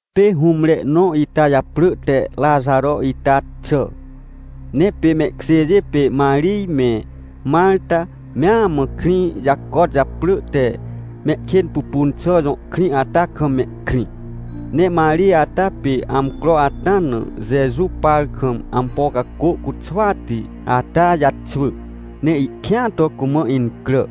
Pê hũmre nõ ita japrỳ te Raxaro ita xà. Ne pê mehkjêjê pê Marij me Marta mea mã krĩ jacot japrỳ te Mehkênpupunxà jõ krĩ ata kam mehkrĩ. Ne Marij ata pê amcro ata na Jeju par kam ampo cacô cuxwati ata jaxwỳ, ne ihkĩa to cumã incrà.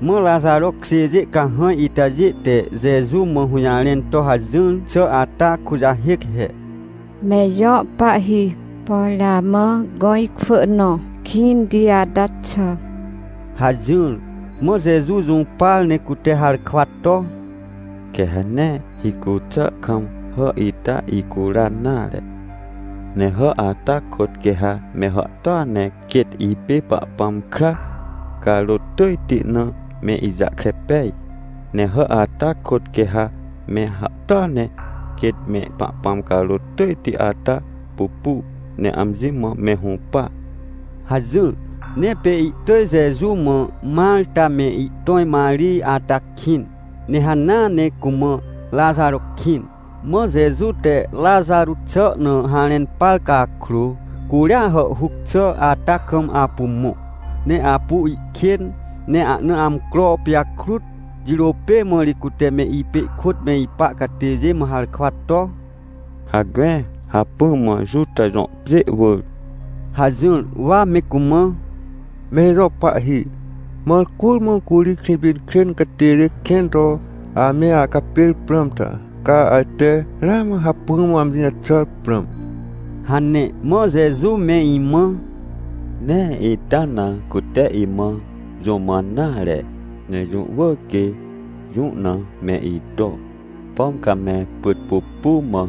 Mã Raxaro kjêjê cahãj itajê te Jeju mã hũjarẽn to hajỹr xà ata kujahêc he: — Me ijõ Pahhi, por amã gõ ikwỳ nõ kĩnti ata xà! — hajỹr. Mã Jeju jũpar ne cute harkwa to: — Quê ha nee hicu xà kam hà ita ihcuran nare. Ne hà ata kôt quê ha me hàhtôa ne quêt ipê Pahpãm kra carôt tỳjti na me ijahkre pej. Ne hà ata kôt quê ha me hàhtôa ne quêt me Pahpãm carôt tỳjti ata pupu ne amji mã me hũpa — hajỹr. Ne pê ihtỳj Jeju mã Marta me ihtõj Marij ata kĩn, ne hanea ne cumã Raxaro kĩn. Mã Jeju te Raxaro xà na harẽn par cakrô, curia hàhhuc xà ata kam apu mõ, ne apu ihkên, ne ahna amcro pijakrut. Jirô pê mã ri cute me ipê ihkôt me ipa catêjê mã harkwa to: — Hacme, hacpỹ mã Juta jõ pjê wỳr — hajỹr. Wa me cumã: — Me ijõ Pahhi, mãr curmã curi Krĩpinkrên catêjê kẽn to ame acapêr prãm ta? Ca ajte ramã hacpỹa mã amji jaxàr prãm? — hane. Mã Jeju me imã: — Nee ita na cute imã jũ mãn nare, ne jũ wỳr quê jũ na me ito. Pom ca me pyt pupu, mã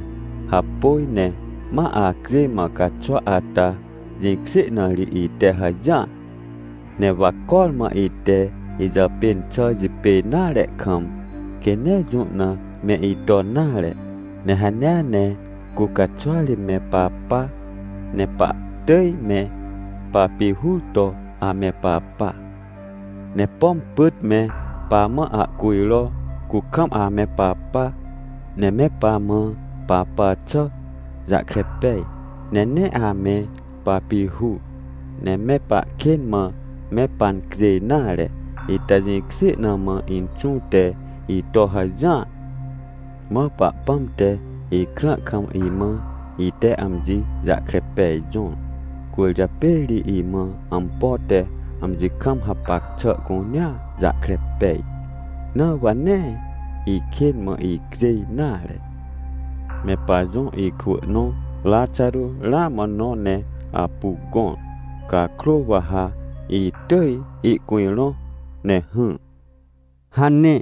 hapôj ne ma acjêj mã caxwa ata jĩkjê na ri ite hajỹar. Ne wa cormã ite ijàpên xà jipêj nare kam, quê nee jũ na me iton nare. Ne hanea ne cu caxwari me papa, ne pahtỳj me papihur to ame papa. Ne pom pyt me pamã ahcujro, cu kam ame papa, ne me pamã papa xà jahkre pej, ne nee ame papihur, ne me pahkên mã me pancjêj nare. Ita jĩkjê na mã Inxũ te ito hajỹar. Mã Pahpãm te ikrã kam imã ite amji jahkre pej jõr, cwỳrjapê ri imã ampo te amji kam hapac xà cunea jahkre pej, na wa nee ikên mã icjêj nare. — Me pajõ ikwỳ nõ Raxaro ramã nõ ne apu gõr cakrô, wa ha itỳj ihcujrõ ne hỹr — hane.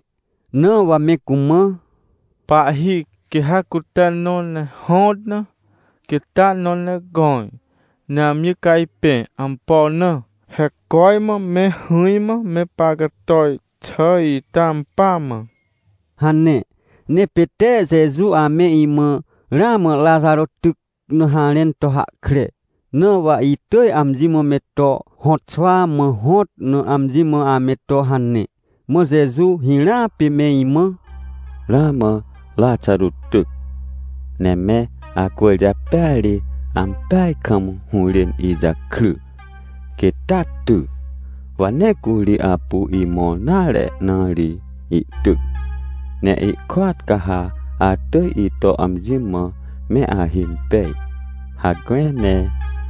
Na wa me cumã: — Pahhi, quê ha cute nõ ne hõt na, quêt taa nõ ne gõr, ne amji cajpẽ. Ampo na? He cormã me hỹrmã me pahcator xà ita ampỳa mã — hane. Ne pê tee Jeju ame imã ramã Raxaro tyc na harẽn to hahkre, na wa itỳj amji mã me to hõtxwa mã hõt na amji mã ame to hane! Mã Jeju hirãa pê me imã: — Ramã Raxaro tyc, ne me acwỳrjapêa ri, ampeaj kam hũrên ijakry. Quêt taa ty, wa nee curi apu imõr nare na ri ihtyc. Ne ihkôat ca ha atỳj ito amji mã me ahimpej. Hacme, ne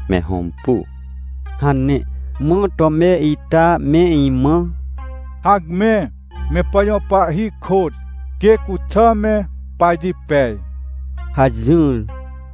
me hõmpu — hane. Mã Tome ita me imã: — Hacme, me pajõ Pahhi kôt, quê cuxà me pajipej — hajỹr.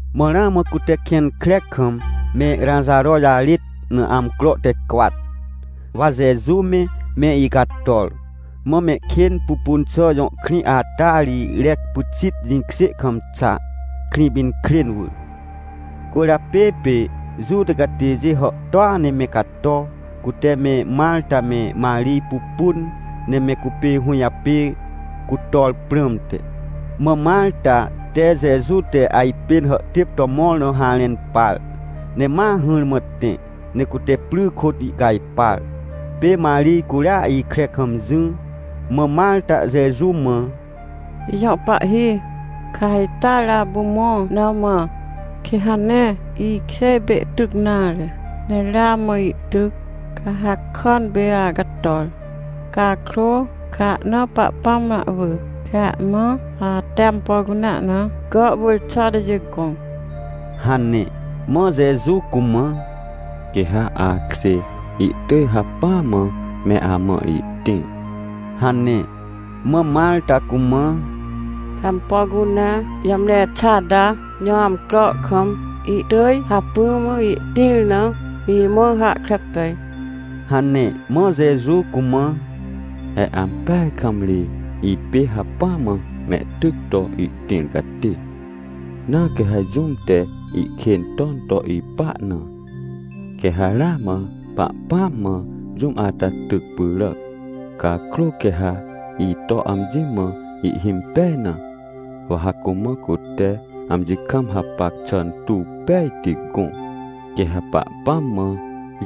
Mã ramã cute kẽn kre kam me Raxaro jarêt na amcro te cwat, wa Jeju me, me icator. Mã Mehkênpupunxà jõ krĩ ata ri rec pyxit jĩkjê kam xa, Krĩpinkrên wỳr. Cwỳrjapê pê Juta catêjê hàhtôa ne me cato, cute me Marta me Marij pupun, ne me cupê hũjapê cutor prãmte. Mã Marta te Jeju te ajpên hàhtêp to mõr na harẽn par, ne ma hỹrmã tẽ ne cute pry kôt ihcajpar. Pê Marij curia ikre kam jỹ. Mã Marta Jeju mã: — Ijõ Pahhi, ca ha ita ri apu mõ na mã, quê ha nee ikjê ipê ihtyc nare, ne ramã ihtyc, ca hakàn pê acator. Cakrô ca ha ahnaa Pahpãm na ahwỳ, quê ha amã ate ampo cunea na gàhwỳr xà atajê gõ — hane. Mã Jeju cumã: — Quê ha akjê ihtỳj hacpỹa mã me amã ihtĩr — hane. Mã Marta cumã: — Quê ha ampo cunea jamre xà ata jõ amcro kam ihtỳj hacpỹa mã ihtĩr na, imã hahkre pej — hane. Mã Jeju cumã: — He ampeaj kam ri, ipê hacpỹa mã mehtyc to ihtĩr catê. Na quê ha jũm te ihkên ton to ipa na, quê ha ramã Pahpãm mãa jũm ata tyc pyràc. Cakrô quê ha ito amji mã ihhimpej na, wa ha cumã cute amji kam hapac xà tuw pejti gõ, quê ha Pahpãm mã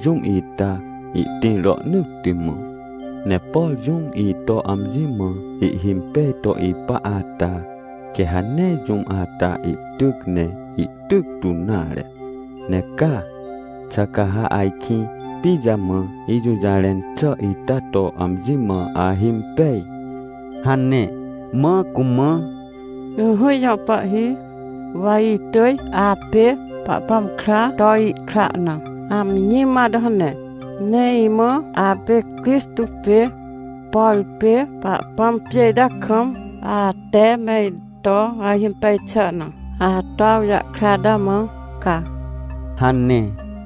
jũm ita ihtĩr rohnỳtti mã. Ne por jũm ito amji mã ihhimpej to ipa ata, quê ha nee jũm ata ihtyc ne ihtyc tu nare. Ne ca? Xà ca ha ajkĩ pijamã ijũjarẽn xà ita to amji mã ahimpej? — hane. Mã cumã: — Ỹhỹ ijõ Pahhi, wa itỳj apê Pahpãm kraa to ihkra na amji mã ato hane, ne imãa apê Crixtô pê, por pê Pahpãm pjê ita kam ate me ito ahimpej xà na ato awjahkre ata mã ca — hane.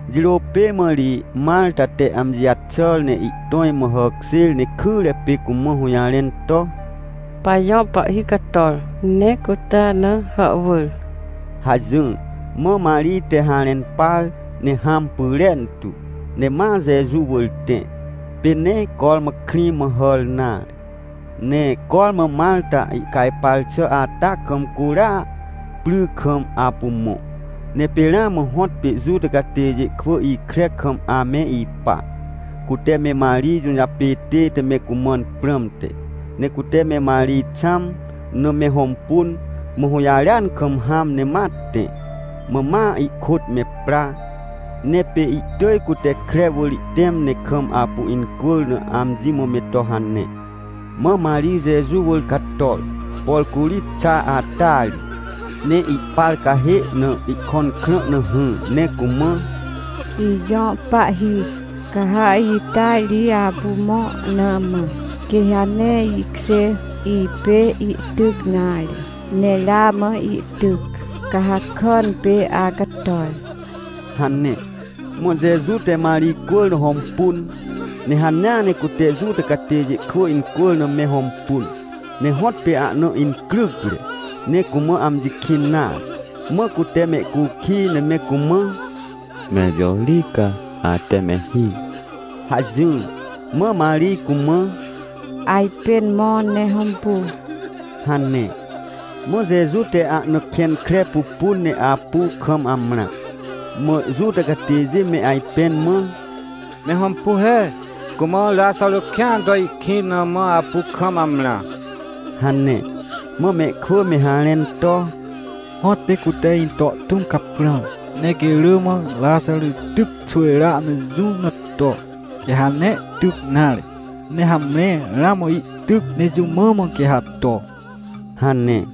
Jirô pê mã ri Marta te amji jaxàr ne ihtõj mã hàkjêr ne kyre pê cumã hũjarẽn to: — Pajõ Pahhi cator ne cute ana hàhwỳr — hajỹr. Mã Marij te harẽn par, ne hãm pyrentu, ne ma Jeju wỳr tẽ. Pê nee cormã krĩ mã hàr nare, ne cormã Marta ihcajpar xà ata kam, curia pry kam apu mõ. Ne pê ramã hõtpê Juta catêjê kwỳ ikre kam ame ipa, cute me Marij jũjapê tête me cumãn prãmte. Ne cute me Marij xãm na me hõmpun, mã hũjarêan kam hãm ne ma tẽ, mã ma ihkôt me pra. Ne pê ihtỳj cute kre wỳr ihtẽm ne kam apu incwỳr na amji mã me to hane. Mã Marij Jeju wỳr cator, por curi xa ata ri, ne ihpar cahê na ihkõn krã na hỹr, ne cumã: — Ijõ Pahhi, ca ha ita ri apu mõ na mã, quê ha nee ikjê ipê ihtyc nare, ne ramã ihtyc, ca hakàn pê acator — hane. Mã Jeju te Marij cwỳr na hõmpun. Ne hanea ne cute Juta catêjê kwỳ incwỳr na me hõmpun. Ne hõtpê ahna incrycre, ne cumã amji kĩn nare. Mã cute mehcukij, ne me cumã: — Mẽr jõ ri ca ate me hir? — hajỹr. Mã Marij cumã: — Ajpên mõ ne hõmpu — hane. Mã Jeju te ahna kẽn kre pupun ne apu kam amrã. Mã Juta catêjê me ajpẽn mã: — Me hõmpu he, cumã Raxaro kĩan to ihkĩn na mã apu kam amrã! — hane. Mã mehkwỳ me harẽn to: — Hõtpê cute into tũm caprãr, ne quê rỳ mã Raxaro tyc xwỳjrea na jũ na to, quê ha nee ihtyc nare. Ne hamre ramã ihtyc, ne jũ mã mã quê ha to? — hane.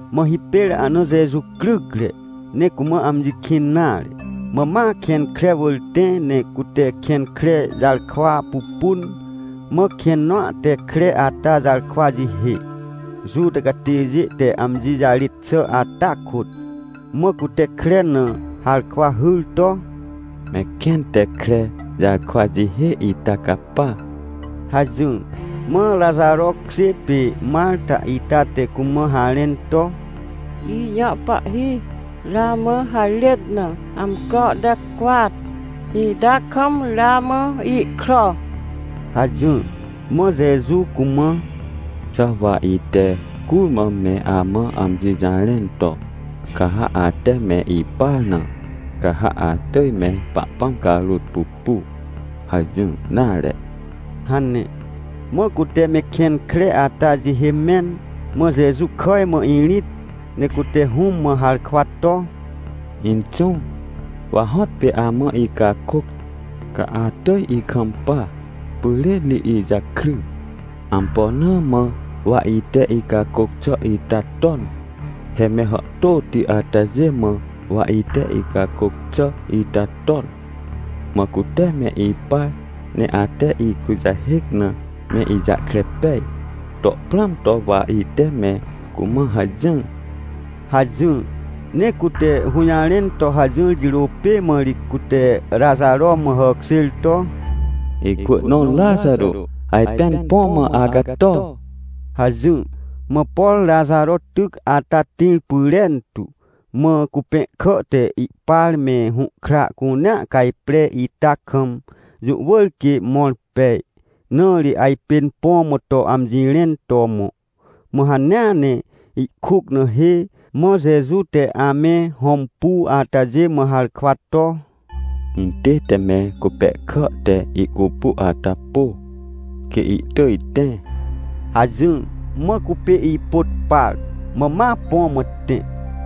Mã hipêr ahna Jeju crycre, ne cumã amji kĩn nare, mã ma kẽn kre wỳr tẽ, ne cute kẽn kre jarkwa pupun, mã kẽn nõa te kre ata jarkwa jihê, Juta catêjê te amji jarêt xà ata kôt. Mã cute kre na harkwa hyr to: — Me kẽn te kre jarkwa jihê ita capa — hajỹr. Mã Raxaro kjê pê Marta ita te cumã harẽn to: — Ijõ Pahhi, ramã harêt na amcro te cwat ita kam ramã ihkro — hajỹr. Mã Jeju cumã: — Xà wa ite curmã me amã amji jarẽn to: “Ca ha ate me ipar na, ca ha atỳj me Pahpãm carôt pupu” hajỹr nare? — hane. Mã cute me kẽn kre ata jihê mẽn. Mã Jeju kàj mã irĩt ne cute Hũm mã harkwa to: — Inxũ, wa hõtpê amã icakôc, ca atỳj ikampa pyrên ri ijakry. Ampo na mã wa ite icakôc xà ita ton? He me hàhtôti atajê mã wa ite icakôc xà ita ton, mã cute me ipar. Ne ate ikujahêc na me ijahkre pej to prãm to wa ite me cumã hajỹr — hajỹr. Ne cute hũjarẽn to hajỹr jirô pê mã ri cute Raxaro mã hàkjêr to: — Ikwỳ nõ Raxaro, ajpên põ mã acato! — hajỹr. Mã por Raxaro tyc ata tĩr pyrentu. Mã cupẽhkà te ihpar me hũhkra cunea cajpre ita kam, jũ wỳr quê mõr pej, na ri ajpên põ mã to amji rẽn to mõ. Mã hanea ne ihkuc na hê. Mã Jeju te ame hõmpu atajê mã harkwa to: — Intête me cupẽhkà te ihcupu ata pô, quê ihtỳj tẽ — hajỹr. Mã cupê ipôt par, mã ma põ mã tẽ.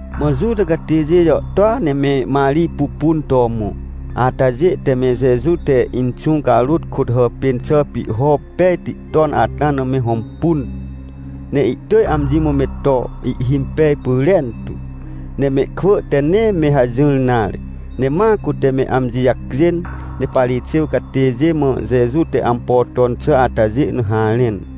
Mã Juta catêjê jàhtôa ne me Marij pupun to mõ atajê, te me Jeju te Inxũ carôt kôt hàpên xà pihho pejti ton ata na me hõmpun, ne ihtỳj amji mã me to ihhimpej pyrentu. Ne mehkwỳ te nee me hajỹr nare, ne ma cute me amji jacjên, ne Parixêw catêjê mã, Jeju te ampo ton xà atajê na harẽn.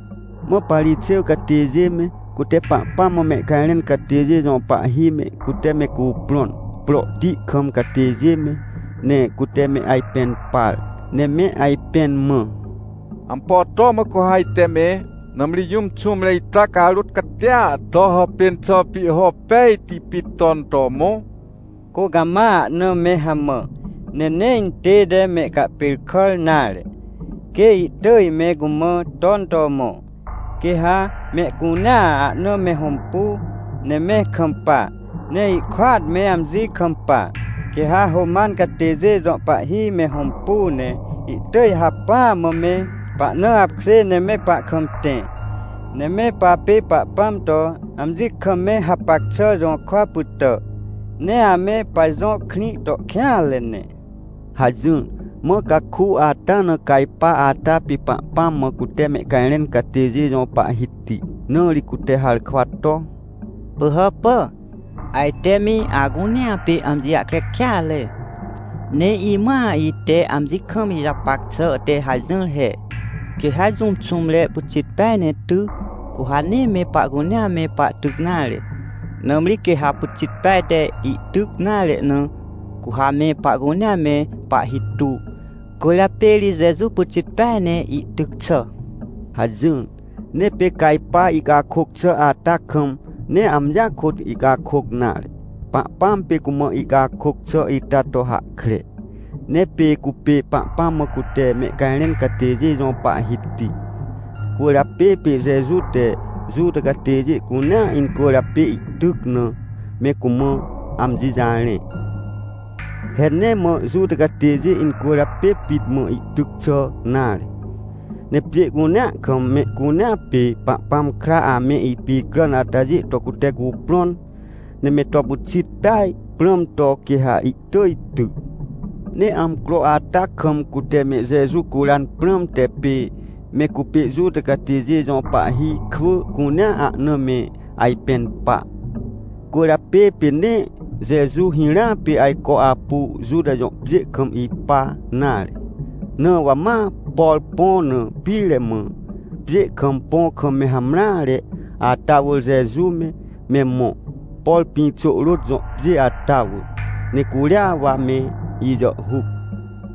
Mã Parixêw catêjê me, cute Pahpãm mã mehcajrẽn catêjê jõ pahhi me, cute me cuprõn, prohti kam catêjê me, ne cute me ajpẽn par, ne me ajpẽn mã: — Ampo to mã cu ha ajte me? Nãmri jũm xũmre ita carôt catia to hàpên xà pihho pejti pit ton to mõ. Cu cama ahna me hamã, ne nee intête mehcahpêrkàr nare, quê ihtỳj me cumã ton to mõ, quê ha mehcunea ahna me hõmpu, ne me kampa, ne ihkôat me amji kampa. Quê ha Roman catêjê jõ pahhi me hõmpu, ne ihtỳj hacpỹa mã me pahna apkjê, ne me pahkam tẽ, ne me papê Pahpãm to amji kam me hapac xà jũrkwa pytà, ne ame pajõ krĩ to kêanre ne — hajỹr. Mã caku ata na Cajpa ata pê Pahpãm mã cute mehcajrẽn catêjê jõ pahhiti. Na ri cute harkwa to: — Pỳhàpà, ajte me acunea pê amji jahkre kêatre! Ne imãa ite amji kam ijapac xà te hajỹr he. Quê ha jũm xũmre pyxit peaj ne ty, cu ha nee me pahcunea me pahtyc nare. Nãmri quê ha pyxit peaj te ihtyc nare na, cu ha me pahcunea me pahhi tu. Cwỳrjapê ri Jeju pyxit peaj ne ihtyc xà — hajỹr. Ne pê Cajpa ihcakôc xà ata kam, nee amjia kôt ihcakôc nare, Pahpãm pê cumã ihcakôc xà ita to hahkre. Ne pê cupê Pahpãm mã cute mehcajrẽn catêjê jõ pahhiti. Cwỳrjapê pê Jeju te Juta catêjê cunea incwỳrjapê ihtyc na, me cumã amji jarẽ. He nee mã Juta catêjê incwỳrjapê pit mã ihtyc xà nare. Ne pjê cunea kam, mehcunea pê Pahpãm kra ame ipicràn atajê to cute cuprõn, ne me to pyxit peaj prãm to, quê ha ihtỳj ty. Ne amcro ata kam cute me Jeju curan prãmte pê me cupê Juta catêjê jõ pahhi kwỳ cunea ahna me ajpẽn pa. Cwỳrjapê pê nee Jeju hirã pê ajco apu Juta jõ pjê kam ipa nare. Na wa ma, por põ na pire mã, pjê kam põ kam me hamreare ata wỳr Jeju me, me mõ, por Pĩxôhrôt jõ pjê ata wỳr, ne curia wa me ijàhhuc.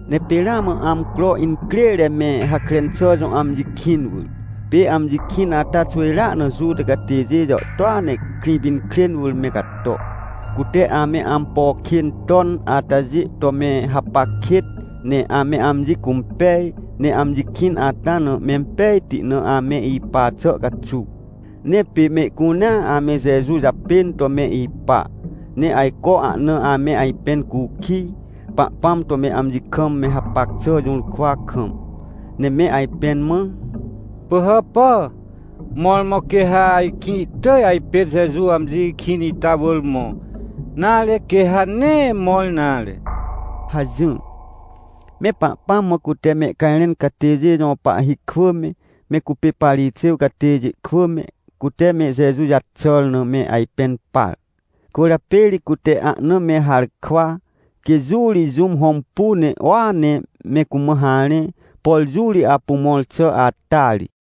Ne pê ramã amcro incrêre me Hakren xà jõ amji kĩn wỳr. Pê amji kĩn ata xwỳjrea na Juta catêjê jàhtôa ne Krĩpinkrên wỳr me cato, cute ame ampo kên ton atajê to me hapac kêt, ne ame amji cũmpej. Ne amji kĩn ata na mempejti na ame ipa xà caxuw. Ne pê mehcunea ame Jeju japên to me ipa, ne ajco ahna ame ajpẽn cukij, Pahpãm to me amji kam me hapac xà jũrkwa kam. Ne me ajpẽn mã: — Pỳhàpà, mõrmõ quê ha ajkĩ ihtỳj ajpên Jeju amji kĩn ita wỳr mõ, nare, quê ha nee mõr nare? — hajỹr. Me Pahpãm mã cute mehcajrẽn catêjê jõ pahhi kwỳ me, me cupê Parixêw catêjê kwỳ me, cute me Jeju jaxàr na me ajpẽn par. Cwỳrjapê ri cute ahna me harkwa, quê jũ ri jũm hõmpu, ne uua ne me cumã harẽ, por jũ ri apu mõr xà ata ri.